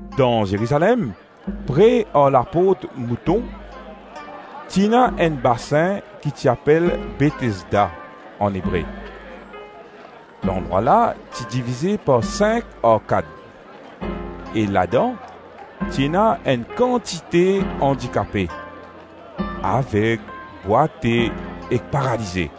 Dan Zerizalem, pre ar laport-mouton, ti ena enn basin ki ti apel Betesda an Ebre. Landrwa la ti divize par sink arkad. E ladan, ti ena enn kantite andikape: aveg, bwate ek paralize. [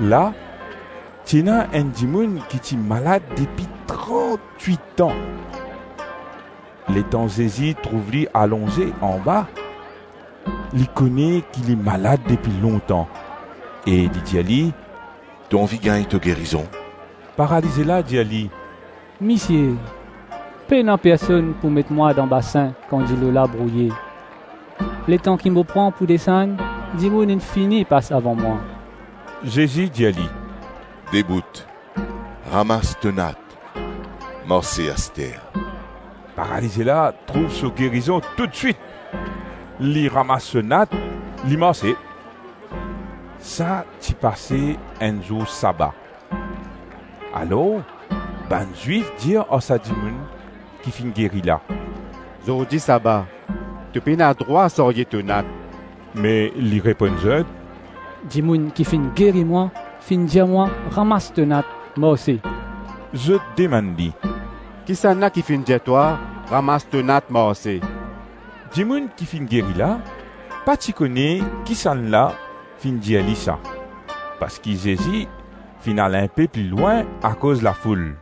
La, ti ena enn dimoun ki ti malad depi trantwit-an. Letan Zezi trouv li alonze anba, li kone ki li malad depi lontan e li dir li, “To anvi gagn to gerizon?” Paralize la dir li, “Misie, pena personn pou met mwa dan basin kan dilo la brouye; letan ki mo pran pou desann, dimoun inn fini pas avan mwa.” Zezi dir li, “Debout, ramas to nat, marse aster.” Paralize la trouv so gerizon toutswit; li ramas so nat, li marse. Sa ti pase enn zour saba. Alors bann Zwif dir ar sa dimoun ki finn geri la, “Zordi saba, to pena drwa sarye to nat.” Me li reponn zot, “Dimoun ki finn geri mwa, finn dir mwa, ramas to nat, marse’.” Zot demann li, “Kisannla ki finn dir twa, Ramas to nat, marse?” Dimoun ki finn geri la, pa ti kone kisannla finn dir li sa, parski Zezi finn al inpe pli lwin akoz lafoul.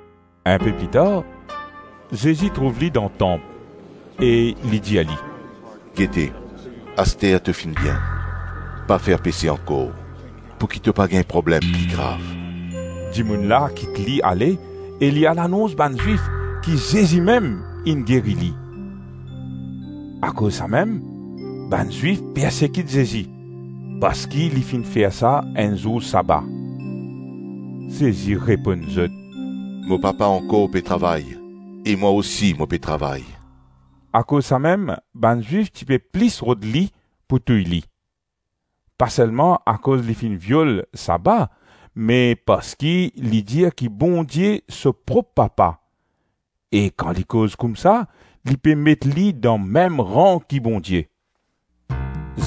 Inpe pli tar, Zezi trouv li dan tanp e li dir li, “Gete, aster to finn bien, pa fer pese ankor pouki to pa gagn problem pli grav.” Dimoun la kit li ale e li al anons bann Zwif ki Zezi mem inn geri li. Akoz samem, bann Zwif persekit Zezi, parski li finn fer sa enn zour saba. Zezi reponn zot, “Mo Papa ankor pe travay e mwa osi mo pe travay.” Akoz samem, bann Zwif ti pe plis rod li pou touy li. Pa selman akoz li finn viol saba me parski li dir ki Bondie so prop Papa e kan li koz koumsa, li pe met li dan mem ran ki Bondie.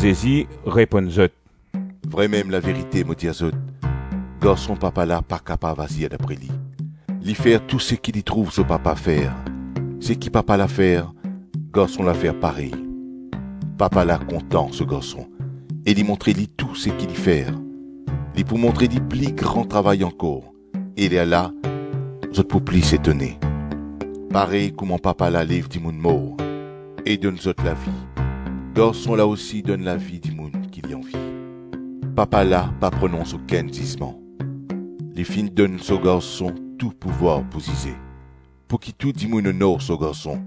Zezi reponn zot, “Vremem laverite mo dir zot, Garson Papa la pa kapav azir dapre li, li fer tou seki li trouv so Papa fer; seki Papa la fer, Garson la fer parey. Papa la kontan so Garson e li montre li tou seki li fer; li pou montre li pli gran travay ankor e lerla, zot pou plis etone. Parey kouma Papa la lev dimoun mor e donn zot lavi, Garson la osi donn lavi dimoun ki li anvi. Papa la pa pronons okenn zizman, li finn donn so Garson tou pouvwar pou zize, pouki tou dimoun onor so Garson,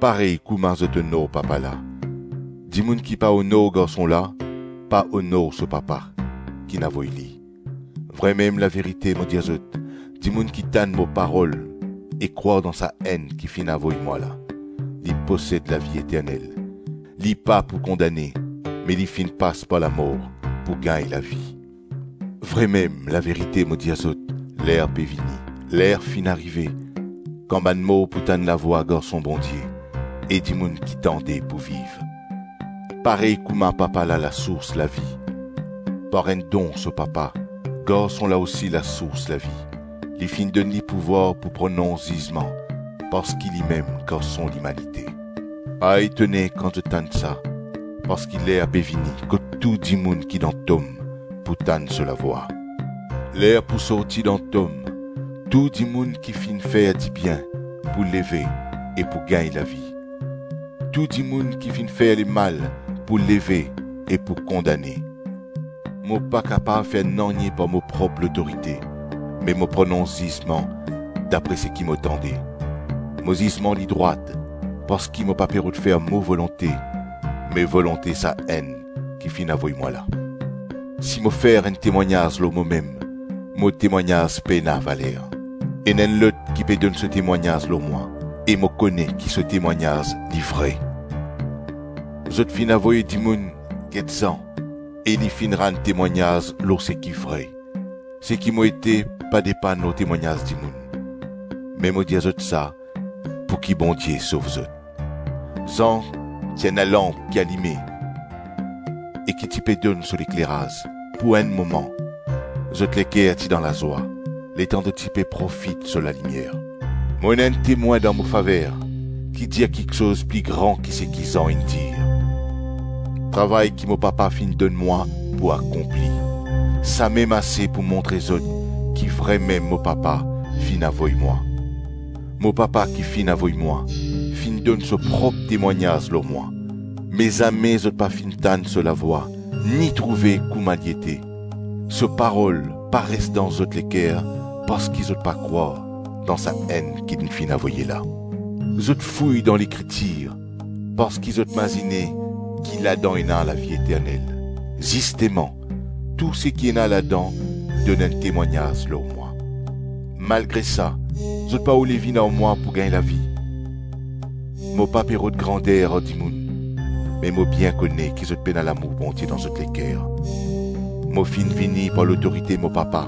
parey kouma zot onor Papa la. Dimoun ki pa onor Garson la, pa onor so Papa kinn avoy Li. Vremem laverite mo dir zot, dimoun ki tann mo parol e krwar dan Sa-Enn ki finn avoy mwa la, li posed lavi eternel; li pa pou kondane me li finn pas par lamor pou gagn lavi. Vremem laverite mo dir zot, ler pe vini, ler la finn arive, kan bann mor pou tann lavwa Garson Bondie e dimoun ki tande pou viv. Parey kouma Papa la lasours lavi, par enn don so Papa, Garson la osi lasours lavi. Li finn donn li pouvwar pou pronons zizman parski limem Garson Limanite. Pa etone kan zot tann sa, parski ler pe vini kot tou dimoun ki dan tom pou tann so lavwa. Ler pou sorti dan tom, tou dimoun ki finn fer dibien pou leve e pou gagn lavi; tou dimoun ki finn fer lemal pou leve e pou kondane. Mo pa kapav fer nanye par mo prop lotorite me mo pronons zizman dapre seki mo tande; mo zizman li drwat parski mo pa pe rod fer mo volonte me volonte Sa-Enn ki finn avoy mwa la. Si mo fer enn temwagnaz lor momem, mo temwagnaz pena valer. Ena enn lot ki pe donn so temwagnaz lor mwa e mo kone ki so temwagnaz li vre. Zot finn avoy dimoun get Zan e li finn rann temwagnaz lor seki vre. Seki mo ete pa depann lor temwagnaz dimoun, me mo dir zot sa, pouki Bondie sov zot. Zan ti enn lalanp ki alime e ki ti pe donn so lekleraz; pou enn moman, zot leker ti dan lazwa letan zot ti pe profit so lalimier. Mo ena enn temwin dan mo faver ki dir kiksoz pli gran ki seki Zan inn dir. Travay ki mo Papa finn donn mwa pou akonpli, samem ase pou montre zot, ki vremem mo Papa finn avoy mwa. Mo Papa ki finn avoy mwa, finn donn so prop temwagnaz lor mwa; me zame zot pa finn tann so lavwa, ni trouve kouma li ete. So parol pa res dan zot leker parski zot pa krwar dan Sa-Enn ki li finn avoye la. Zot fouy dan Lekritir parski zot mazine ki ladan ena lavi eternel; zisteman tou seki ena ladan donn enn temwagnaz lor mwa. Malgre sa, zot pa oule vinn ar mwa pou gagn lavi. Mo pa pe rod grander ar dimoun, me mo bien kone ki zot pena lamour Bondie dan zot leker. Mo finn vini par lotorite mo Papa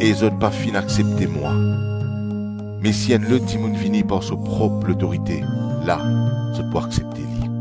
e zot pa finn aksepte mwa; me si enn lot dimoun vini par so prop lotorite, la, zot pou aksepte li.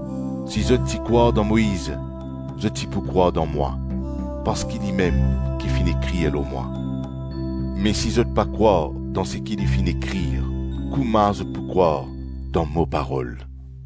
Si zot ti krwar dan Moiz, zot ti pou krwar dan mwa, parski limem ki finn ekrir lor mwa. Me si zot pa krwar dan seki li finn ekrir, kouma zot pou krwar dan mo parol?”